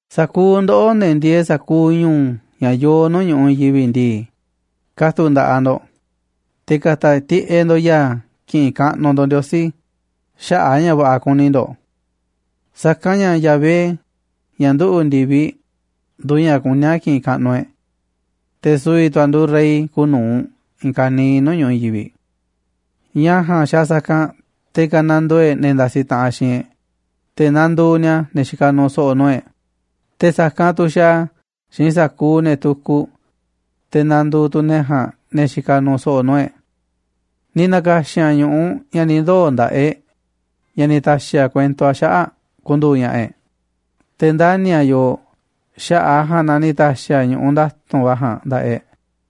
Sa̱kuuꞌ ndoꞌó, ne̱ ndieeꞌ sa̱kuuꞌ ñu̱u̱ ña̱ yooꞌ nuu̱ꞌ ñu̱ꞌuꞌ i̱i̱n yivi̱ꞌ ndii, ka̱tu̱ꞌ nda̱ꞌaꞌ ndo̱ꞌ, te̱ ka̱ta̱ tiꞌeꞌ ndo̱ꞌ ya̱a̱ ki̱ꞌi̱n kaꞌnuꞌ ndo̱ꞌ Ndiosí xaꞌa̱ꞌ a̱ ña̱ va̱ꞌa̱ kuni ndo̱ꞌ. Sa̱kanꞌ ña̱ Yahvé, ña̱ nduꞌu̱ꞌ ndi̱viꞌ, nduuꞌ ña̱ kuní a̱ ki̱ꞌi̱n kaꞌnuꞌ e̱ꞌ. Te̱ su̱vi̱ tu̱ a̱ nduuꞌ Rey kuuꞌ nu̱uꞌ i̱i̱n ka̱niiꞌ nuu̱ꞌ ñu̱ꞌuꞌ i̱i̱n yivi̱ꞌ. Ña̱ ja̱a̱nꞌ xaaꞌ sa̱kanꞌ te̱ kanandoo e̱ꞌ ne̱ ndasi taꞌanꞌ xiinꞌ e̱ꞌ, te̱ nanduuꞌ ni̱a̱ ne̱ xikaꞌ nuuꞌ so̱ꞌo̱ nuu̱ꞌ e̱ꞌ, te̱ sa̱kanꞌ tu̱ xaaꞌ a̱ xiinꞌ sa̱kuuꞌ ne̱ tukuꞌ te̱ nanduuꞌ tu̱ ne̱ ja̱a̱nꞌ ne̱ xikaꞌ nuuꞌ so̱ꞌo̱ nuu̱ꞌ e̱ꞌ. Ni̱ na̱ka̱xi̱n a̱ ñu̱ꞌuꞌ ña̱ ni̱ ndoo̱ nda̱ꞌaꞌ e̱ꞌ, ña̱ ni̱ ta̱xi̱ a̱ kuento a̱ xaꞌa̱ꞌ ku̱ndu̱u̱ ña̱ꞌa̱ e̱ꞌ, te̱ ndani̱ a̱ yooꞌ xaꞌa̱ꞌ a̱ ja̱a̱nꞌ na ni̱ ta̱xi̱ a̱ ñu̱ꞌuꞌ nda̱tu̱nꞌ va̱ ja̱a̱nꞌ nda̱ꞌaꞌ e̱ꞌ.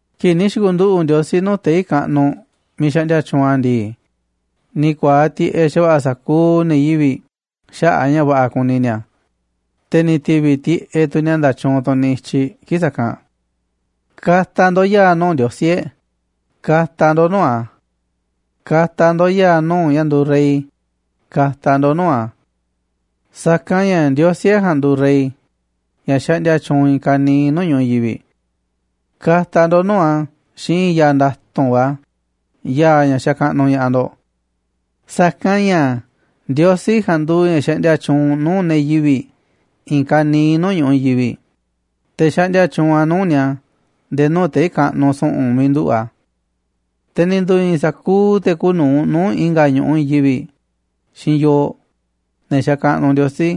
Kii̱ꞌ ni̱ xi̱ku̱nduꞌu̱ꞌ Ndiosí nuu̱ꞌ tei̱ kaꞌnuꞌ miiꞌ xaꞌndia tyuunꞌ a̱ ndii, ni̱ ku̱a̱aꞌ tiꞌeꞌ xa̱va̱ꞌa̱ sa̱kuuꞌ ne̱ yivi̱ꞌ xaꞌa̱ꞌ a̱ ña̱ va̱ꞌa̱ kuni ni̱a̱, te̱ ni̱ ti̱vi̱ tiꞌeꞌ tu̱ ni̱a̱ nda̱tyuunꞌ tunꞌ nityiꞌ kii̱ꞌ sa̱kanꞌ. Ka̱ta̱ ndo̱ꞌ ya̱a̱ nuu̱ꞌ Ndiosí e̱ꞌ, ka̱ta̱ ndo̱ꞌ nuu̱ꞌ a̱. Ka̱ta̱ ndo̱ꞌ ya̱a̱ nuu̱ꞌ ña̱ nduuꞌ Rey, ka̱ta̱ ndo̱ꞌ nuu̱ꞌ a̱. Sa̱kanꞌ ña̱ Ndiosí e̱ꞌ ja̱a̱nꞌ nduuꞌ Rey ña̱ xaꞌndia tyuunꞌ i̱i̱n ka̱niiꞌ nuu̱ꞌ ñu̱ꞌuꞌ i̱i̱n yivi̱ꞌ. Ka̱ta̱ ndo̱ꞌ nuu̱ꞌ a̱ xiinꞌ i̱i̱n ya̱a̱ nda̱tu̱nꞌ va̱, ya̱a̱ ña̱ xakaꞌnuꞌ ña̱ꞌaꞌ ndo̱ꞌ. Sa̱kanꞌ ña̱ Ndiosí ja̱a̱nꞌ nduuꞌ ña̱ xaꞌndia tyuunꞌ nuu̱ꞌ ne̱ yivi̱ꞌ i̱i̱n ka̱niiꞌ nuu̱ꞌ ñu̱ꞌuꞌ i̱i̱n yivi̱ꞌ, te̱ xaꞌndia tyuunꞌ a̱ nuu̱ꞌ ni̱a̱ nde̱e̱ nuu̱ꞌ tei̱ kaꞌnuꞌ su̱ꞌu̱n miiꞌ nduꞌu̱ꞌ a̱. Te̱ ni̱ ndu̱i̱i̱n tu̱ sa̱kuuꞌ te̱ kuuꞌ nu̱uꞌ nuu̱ꞌ i̱nga̱ ñu̱ꞌuꞌ i̱i̱n yivi̱ꞌ xiinꞌ yooꞌ, ne̱ xakaꞌnuꞌ Ndiosí,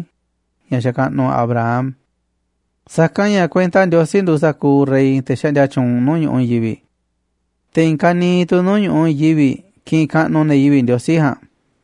ña̱ xakaꞌnuꞌ Abraham. Sa̱kanꞌ ña̱ kuenta Ndiosí nduuꞌ sa̱kuuꞌ rey, te̱ xaꞌndia tyuunꞌ nuu̱ꞌ ñu̱ꞌuꞌ i̱i̱n yivi̱ꞌ. Te̱ i̱i̱n ka̱niiꞌ tu̱ nuu̱ꞌ ñu̱ꞌuꞌ i̱i̱n yivi̱ꞌ kiꞌinꞌ kaꞌnuꞌ ne̱ yivi̱ꞌ Ndiosí ja̱a̱nꞌ.